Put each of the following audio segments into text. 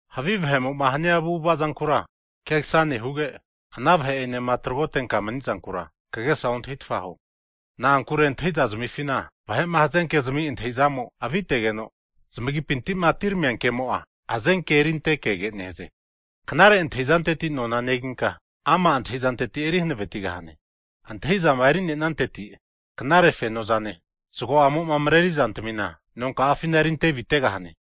Havi vahe'mo'ma hania avu'ava zankura kegasane huge, ana vahe'enema tragotenka mani'zankura, kagesa ontahitfa huo. Na'ankure antahiza zamifina vahe'ma hazenke'zami antahi'zamo avitegeno, zamagipinti'ma atineramia ke'mo'a, hazenke erinte kege nehaze. Knare antahi'zanteti nona neginka, ama' antahi'zanteti eri hanavetigahane. Antahi'zama eri'nenanteti, knare fenozane zago'amo'ma mareri zantamina nonka'afina erinte avitegahane.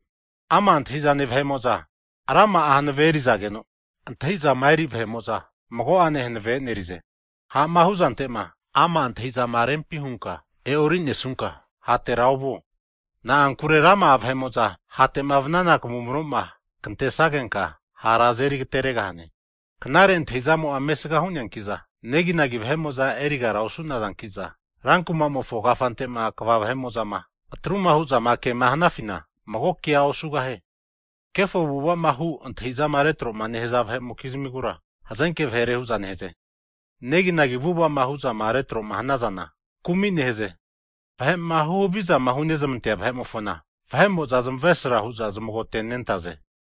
Ama' antahi'zane vahe'mo'za rama'a hanave eri'zageno, antahi'zama eri vahe'mo'za mago'ane hanavea e'nerize. Ha'ma hu'zante'ma ama' antahi'zama hunka e'orinesunka, hatera ovuo. Na'ankure rama'a vahe'mo'zama hate'ma vanana kavumro'ma kantesagenka, hara azeri agateregahane. Knare antahi'zamo'a mesga hu'neanki'za, neginagi vahe'mo'za erigara osu'nazanki'za, rankumamofo kafante'ma kva vahe'mo'zama atruma hu'zama kema hanafina, mago kea osugahie. Kefo avu'ava'zama hu antahi'zama retro'ma nehaza vahe'mokizmigura, hazenke vahere hu'za nehaze. Neginagi avu'ava'ma hu'zama retro'ma hanazana, kumi nehaze. Vahe'ma huhavizama hunezmantea vahe'mofona, vahe'mo'za zamavesra hu'za zamagote'nentaze.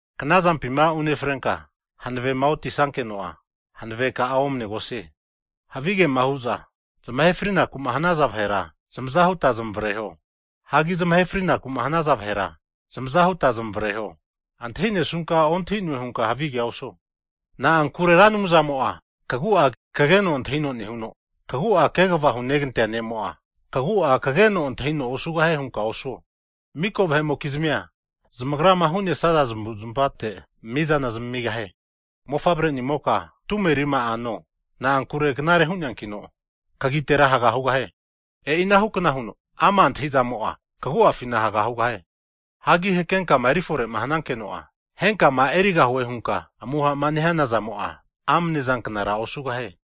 Knazampima unefrenka hanavema otisankeno'a, hanaveka'a omanegosie. Havigema hu'za zamahe frinaku'ma hanaza vahera, zamaza huta zamavareho. Hagi zamahe frinaku hanaza vahera, zamaza huta zamavareho. Antahi'nesunka ontahi'noe hunka havigea osuo. Na'ankure Anumzamo'a kagu'a kageno antahino nehuno, kagu'a kegava hunegantea ne'mo'a, kagu'a kageno antahino osugahie hunka osuo. Miko vahe'mokizmia zamagrama hu'nesaza zamavu'zmavate anteno mizana zamamigahie. Mofavre'nimoka tume rima'a no, na'ankure knare hu'neankino, kagitera haga hugahie. E'i anahukna huno, ama' antahi'zamo'a kagu'afina haga hugahie. Hagi hakenkama erifore'ma hanankeno'a, henkama erigahue hunka amuha'ma nehana zamo'a, amnezanknara osugahie.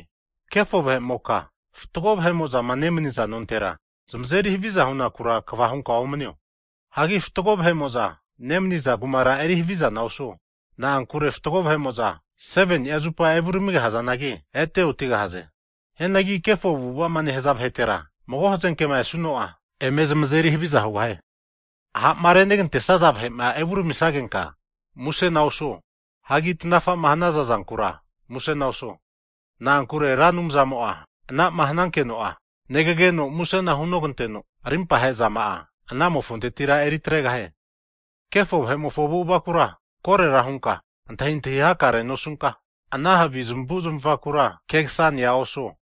Kefo vahe'moka fatgo vahe'mo'zama nemaniza nontera, zamazeri haviza hunakura kva hunka omanio. Hagi fatgo vahe'mo'za nemaniza kumara eri havizana osuo. Na'ankure fatgo vahe'mo'za, 7ni'a zupa evuramiga hazanagi, ete otigahaze. Hianagi kefo avu'ava'ma nehaza vahetema mago hazenkema esuno'a, eme zamazeri haviza hugahie. Ha'ma renegantesaza vahe'ma evuramisagenka, musena osuo. Hagi tanafa'ma hanaza zankura, musena osuo. Na'ankure Ra Anumzamo'a ana'ma hanankeno'a, negageno musena hunoganteno arimpahe zama'a anamofontetira eritregahie. Kefo vahe'mofo avu'avakura korera hunka antahintahi hakarea nosunka, ana havi zamavu zamavakura kegasanea osuo.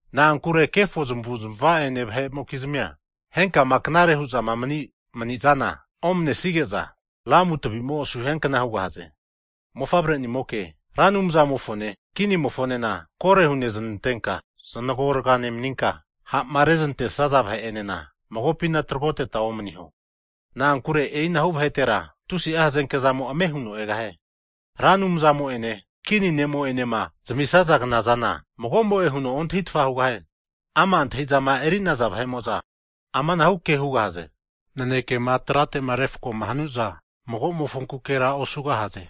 Na'ankure kefo zamavu'zava'ene vahe'mokizmia, henkama knare huzama mani'saza mani'zana omanesige'za, lamu tavi'mo asu hiankna hugahaze. Mofavre'nimoka, Ra Anumzamofone kinimofonena koro huneznantenka zanagorga nemaninka, ha'ma reznantesaza vahe'enena magopina tragoteta omaniho. Na'ankure e'inahu vahetera, tusi'a hazenke zamo ame huno egahie. Ra Anumzamo'ene Kini ne'mo enema zamisaza knazana, mago'mo'e huno ontahitfa hugahie. Ama' antahi'zama eri'naza vahe'mo'za amanahu ke hugahaze. Nanekema trate refkoma hanuza magomofonkukera osugahaze.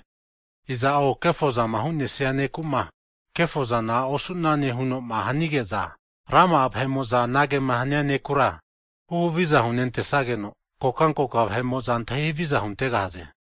Iza'o kefozama hu'nesia neku'ma, kefozana osune huno'ma hanige'za, rama'a vahe'mo'za anagema hania nekura, huhaviza hunentesageno, kokankoka vahe'mo'za antahi haviza huntegahaze.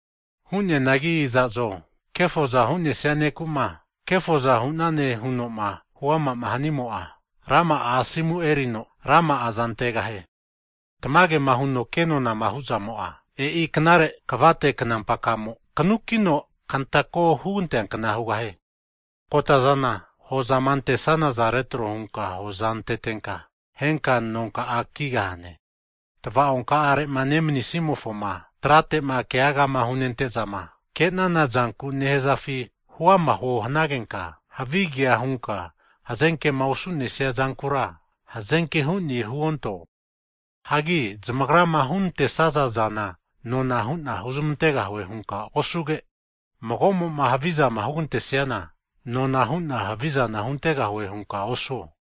Hu'neanagi iza'zo kefoza hu'nesia neku'ma, kefoza hu'ne hu'zama huama'ma hanamo'za, rama'a asomu eri'za rama'aza antegahaze. Tamagema huno ke nonama hu'zamo'a, e'i knare kvate knampaka'amo kanukino kantako huganteankna hugahie. Kotazana hozama antesanaza retro hunka hoza antetenka, henka nonka'a kigahane. Tava'onka'are'ma nemanisimofoma trate'ma kegagama hunentezama, kenana zanku nehazafi huama huo hanagenka, havigea hunka hazenkema osu'nesia zankura, hazenke hu'ne huonto. Hagi zamagrama hunantesaza zana nona hu'na huzamantegahue hunka osuge, mago'mo'ma havizama hugantesiana, nona hu'na havizana huntegahue hunka osuo.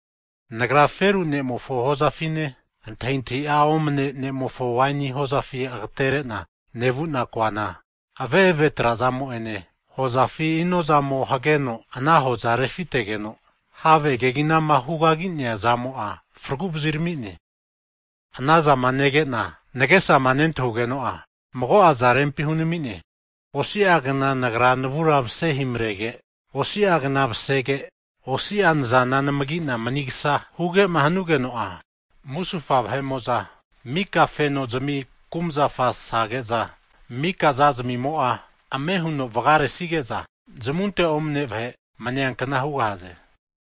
Nagra feru ne'mofo hozafine antahintahi'a omane ne'mofo waini hozafi agatere'na nevu'na koana, ave've trazamo'ene hozafi inozamo hageno ana hoza refitegeno, have keginama hugagi'nea zamo'a fraguvazirami'ne. Ana zama nege'na nagesama nentahugeno'a, mago'aza rempi hunami'ne. Osi'agna nagra navura masehimarege, osi'agna masege, osi'agna nazana anamagi'na manisga huge'ma hanugeno'a, musufa vahe'mo'za mika fenozmi kumzafa sage'za, mika zazmimo'a ame huno vagaresige'za, zamunte omane vahe maniankna hugahaze.